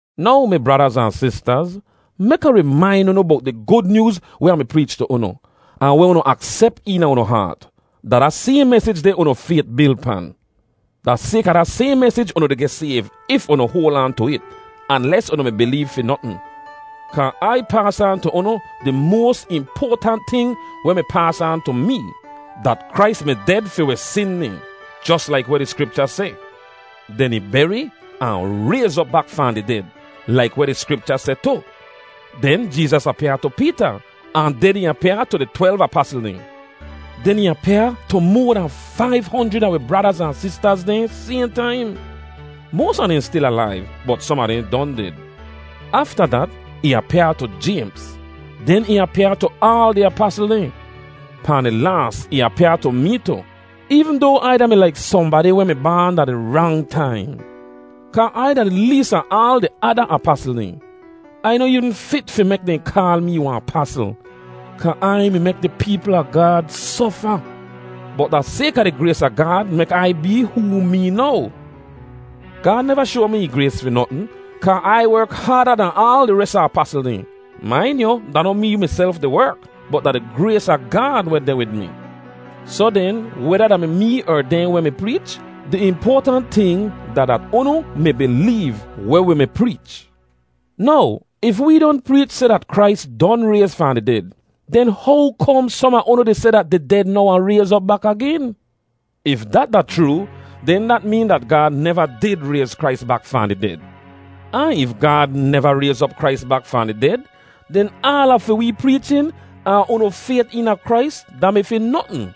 Now, mi bradaz ahn sistaz, mek Ah rimain unu bowt di Gud Nyooz weh Ah mi preech tu unu, ahn weh unu aksep eena unu haat. Da da sayhn mesij deh unu fayt bil pan. Da sayka da sayhn mesij unu di geh sayv if unu hoal aan tu it—anles unu mi bileev fi notn. Kaa Ai paas aan tu unu di moas impoatant ting weh mi paas aan tu mee: dat Krais mi ded fi wi sin dehn, jos laik weh di Skripcha seh, den ih beri, ahn rayz op bak fahn di ded, laik weh di Skripcha seh tu. Den Jeezas apyaa tu Peeta, ahn den ih apyaa tu di twelv apasl dehn. Den ih apyaa tu moa dan faiv honjrid a wi bradaz ahn sistaz dehn sayhn taim. Moas a dehn stil alaiv, bot som a dehn don ded. Afta dat, ih apyaa tu Jaymz; den ih apyaa tu aal di apasl dehn. Pahn di laas, ih apyaa tu mee tu, eevn doa Ai da-mi laik sohnbadi weh mi baan da di rang taim. Kaa Ai da di lees a aal di ada apasl dehn. Ai noh eevn fit fi mek dehn kaal mee wahn apasl, kaa Ai mi mek di peepl a Gaad sofa. Bot da sayka di grays a Gaad mek Ai bee hoo mee now. Gaad neva shoa mi ih grays fi notn, kaa Ai werk haada dahn aal di res a apasl dehn. Main yu, da noh mee miself di werk, bot da di grays a Gaad weh deh wid mi. Soh den, weda da mi mee er dehn weh mi preech, di impoatant ting da dat unu mi bileev weh wi mi preech. Now, if wee don preech seh dat Krais don rayz fahn di ded, den how kom som a unu di seh dat di ded noh wahn rayz op bak agen? If dat da chroo, den dat meen dat Gaad neva did rayz Krais bak fahn di ded. Ahn if Gaad neva rayz op Krais bak fahn di ded, den aala fi wee preechin, ahn unu fayt eena Krais, da-mi fi notn.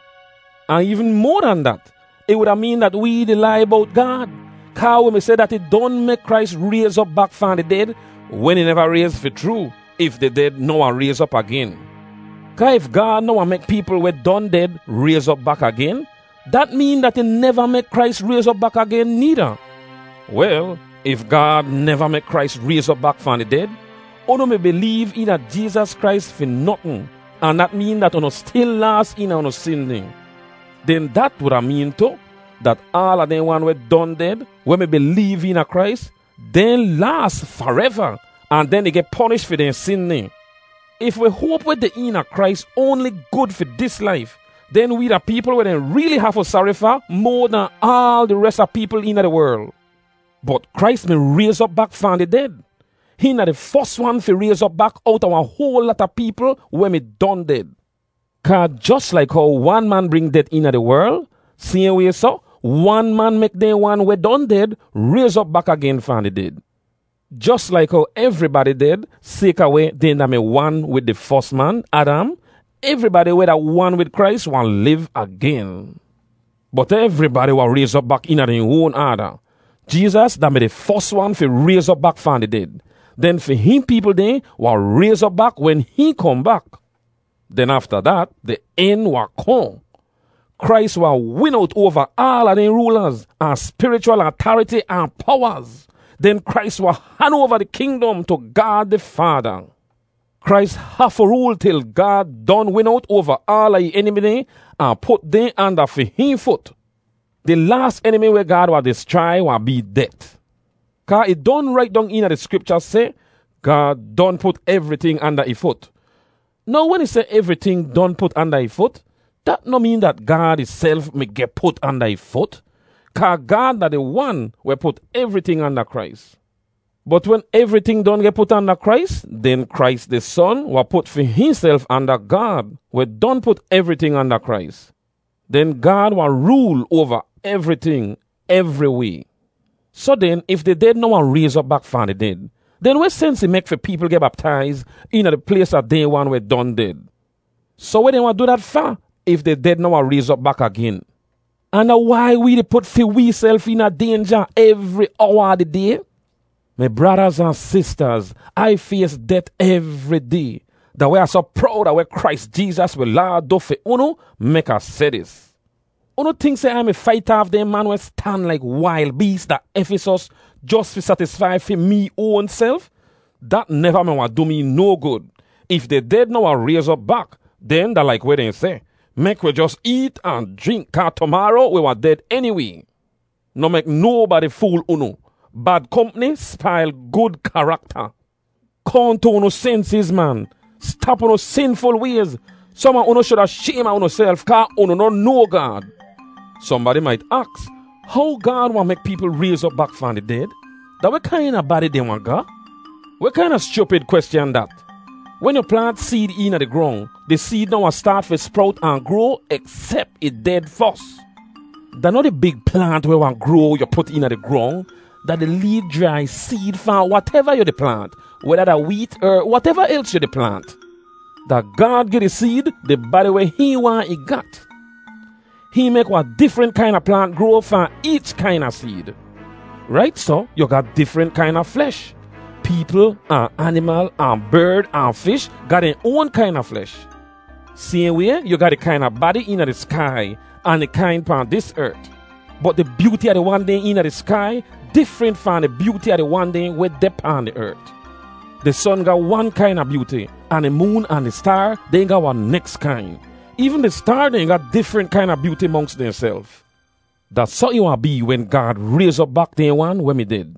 Ahn eevn moa dan dat, ih wuda meen dat wee di lai bowt Gaad, kaa wi mi seh ih don mek Krais rayz op bak fahn di ded wen ih neva rayz fi chroo, if di ded noh wahn rayz op agen. Kaa if Gaad noh wahn mek peepl weh don ded rayz op bak agen, dat meen dat ih neva mek Krais rayz op bak agen needa. Wel, if Gaad neva mek Krais rayz op bak fahn di ded, unu mi bileev eena Jeezas Krais fi notn, ahn dat meen dat unu stil laas eena unu sin dehn. Den dat wuda meen tu, dat aala dehn wan weh don ded, weh mi bileev eena Krais, dehn laas fareva ahn dehn di geh ponish fi dehn sin dehn. If wi hoap weh deh eena Krais oanli gud fi dis laif, den wee da peepl weh dehn reeli hafu sari fa moa dahn aal di res a peepl eena di werl. Bot Krais mi rayz op bak fahn di ded! Hihn da di fos wan fi rayz op bak owta wahn hoal lata peepl weh mi don ded. Kaa jos laik how wan man bring det eena di werl, sayhn way soh, wan man mek dehn wan weh don ded rayz op bak agen fahn di ded. Jos laik how evribadi ded sayka weh dehn da-mi wan wid di fos man, Adam, evribadi weh da wan wid Krais wahn liv agen. Bot evribadi wahn rayz op bak eena dehn oan aada. Jeezas da-mi di fos wan fi rayz op bak fahn di ded; den fi hihn peepl dehn wahn rayz op bak wen hihn kohn bak. Den afta dat, di en wahn kohn. Krais wahn win owt oava aala dehn roolaz, ahn spirichwal atariti ahn powaz. Den Krais wahn han oava di kingdom tu Gaad di Faada. Krais hafu rool til Gaad don win owt oava aala ih enimi dehn ahn put dehn anda fi hihn fut. Di laas enimi weh Gaad wahn dischrai wahn bee det. Kaa ih rait dong eena di Skripcha seh, “Gaad don put evriting anda ih fut.” Now wen ih seh “evriting” don put anda ih fut, dat noh meen dat Gaad ihself mi geh put anda ih fut, kaa Gaad da di Wan weh put evriting anda Krais. Bot wen evriting don geh put anda Krais, den Krais, di Son, wahn put fi hihnself anda Gaad, weh don put evriting anda Krais. Den Gaad wahn rool oava evriting, evriway. Soh den, if di ded noh wahn rayz op bak fahn di ded, den weh sens ih mek fi peepl geh baptaiz eena di plays a dehn wan weh don ded? Soh weh dehn wahn du dat fa if di ded noh wahn rayz op bak agen? Ahn da wai wee di put fi weeself eena daynja evri owa a di day? Mi bradaz ahn sistaz, Ai fays det evri day! Da weh Ah soh prowd a weh Krais Jeezas wi Laad du fi unu mek Ah seh dis. Unu tink seh Ai mi fait aaf dehn man weh stan laik wail bees da Efisos jos fi satisfai fi mee oanself? Dat neva mi wahn du mee no gud. If di ded noh wahn rayz op bak, den da laik weh dehn seh, “Mek wi jos eet, ahn jrink, kaa tumaaro wi wahn ded eniway.” Noh mek nobadi fool unu. Bad kompni spail gud karakta. Kohn tu unu sensiz, man! Stap unu sinful wayz. Som a unu shuda shaym a unuself kaa unu noh noa Gaad. Sohnbadi mait aks, “How Gaad wahn mek peepl rayz op bak fahn di ded? Da weh kaina badi dehn wahn ga?” Weh kaina schupid kweschan dat? Wen yu plaant seed eena di grong, di seed noh wahn staat fi sprowt ahn groa eksep ih ded fos. Da noh di big plaant weh wahn groa yu put eena di grong; da di lee jrai seed fahn wateva yu di plaant, weda da weet er wateva els yu di plaant. Da Gaad gi di seed di badi weh hihn waahn ih gat. Hihn mek wahn difrent kaina plaant groa fahn eech kaina seed. Rait soh, yu ga difrent kaina flesh. Peepl, ahn animal, ahn berd ahn fish ga dehn oan kaina flesh. Sayhn way, yu ga di kaina badi eena di skai ahn di kain pahn dis ert. Bot di byooti a di wan dehn eena di skai difrent fahn di byooti a di wan dehn weh deh pahn di ert. Di son ga wan kaina byooti, ahn di moon ahn di staar dehn ga wahn neks kain. Eevn di staar dehn ga difrent kaina byooti monks dehnself. Da soh ih wahn bee wen Gaad rayz op bak dehn wan weh mi ded.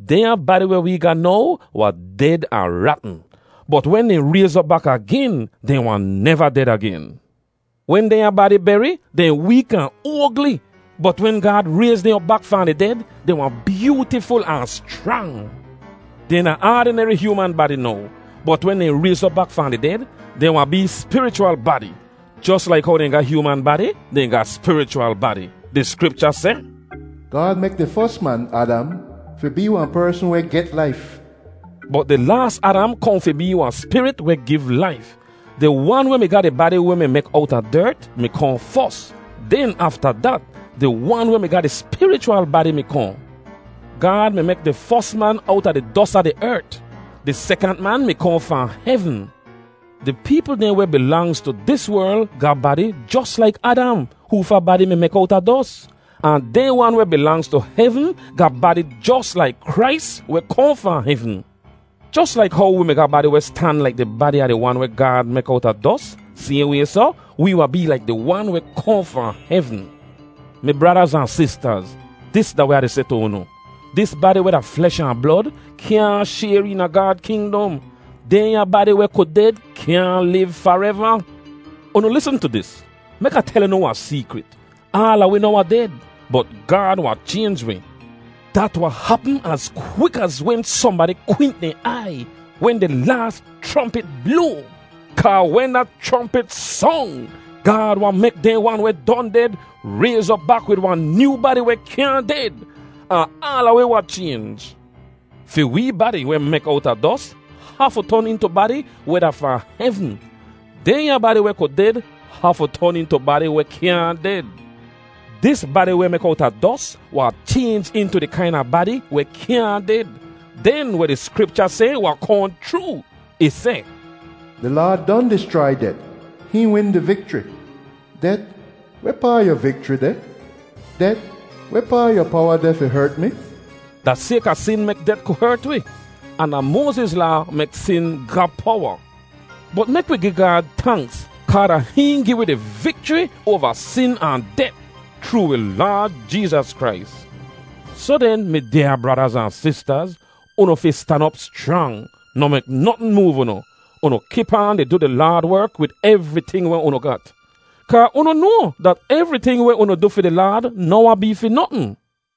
Dehnya badi weh wee ga now wahn ded ahn ratn, bot wen dehn rayz op bak agen, dehn wahn neva ded agen. Wen dehnya badi beri, dehn week ahn oagli, bot wen Gaad rayz dehn op bak fahn di ded, dehn wahn byootiful ahn schrang! Dehn da aadineri hyooman badi now, bot wen dehn rayz op bak fahn di ded, dehn wahn bee spirichwal badi. Jos laik how dehn ga hyooman badi, dehn ga spirichwal badi. Di Skripcha seh, “Gaad mek di fos man, Adam, fi bee wahn persn weh get laif.” Bot di laas Adam kohn fi bee wahn spirit weh giv laif. Di wan weh mi ga di badi weh mi mek owta dert mi kohn fos. Den afta dat, di Wan weh mi ga di spirichwal badi mi kohn. Gaad mi mek di fos man owta di dos a di ert. Di sekant man mi kohn fahn hevn. Di peepl dehn weh bilangz tu dis werl ga badi jos laik Adam, hoofa badi mi mek owta dos. Ahn dehn wan weh bilangz tu hevn ga badi jos laik Krais weh kohn fahn hevn. Jos laik how wi mi ga badi weh stan laik di badi a di wan weh Gaad mek owta dos, sayhn way soh, wi wahn bee laik di Wan weh kohn fahn hevn. Mi bradaz ahn sistaz, dis da weh Ah di seh tu unu: Dis badi weh da flesh ahn blod kyaahn shayr eena Gaad kingdom. Dehnya badi weh ku ded kyaahn liv fareva. Unu lisn tu dis! Mek Ah tel unu wahn seekrit: Aala wi noh wahn ded, bot Gaad wahn chaynj wi. Dat wahn hapm az kwik az wen sohnbadi kwint dehn aiy, wen di laas chrompit bloa. Kaa wen da chrompit song, Gaad wahn mek dehn wan weh don ded rayz op bak wid wahn nyoo badi weh kyaahn ded. Ahn aala wi wahn chaynj. Fi wee badi weh mek owta dos hafu ton intu badi weh da fahn hevn; dehnya badi weh ku ded hafu ton intu badi weh kyaahn ded. Dis badi weh mek owta dos wahn chaynj intu di kaina badi weh kyaahn ded. Den weh di Skripcha seh wahn kohn chroo. Ih seh, “Di Laad don dischrai det, hihn win di vikchri.” “Det, wehpaa yu vikchri deh? Det, wehpaa yu powa deh fi hert mi?” Da sayka sin mek det ku hert wi, ahn da Moaziz Laa mek sin ga powa. Bot mek wi gi Gaad tanks, kaa da hihn gi wi di vikchri oava sin ahn det chroo wi Laad Jeezas Krais! Soh den, mi dyaa bradaz ahn sistaz, unu fi stan op schrang. Noh mek notn moov unu. Unu kip aan di du di Laad werk wid evriting weh unu gat. Kaa unu noa dat evriting weh unu du fi di Laad noh wahn bee fi notn.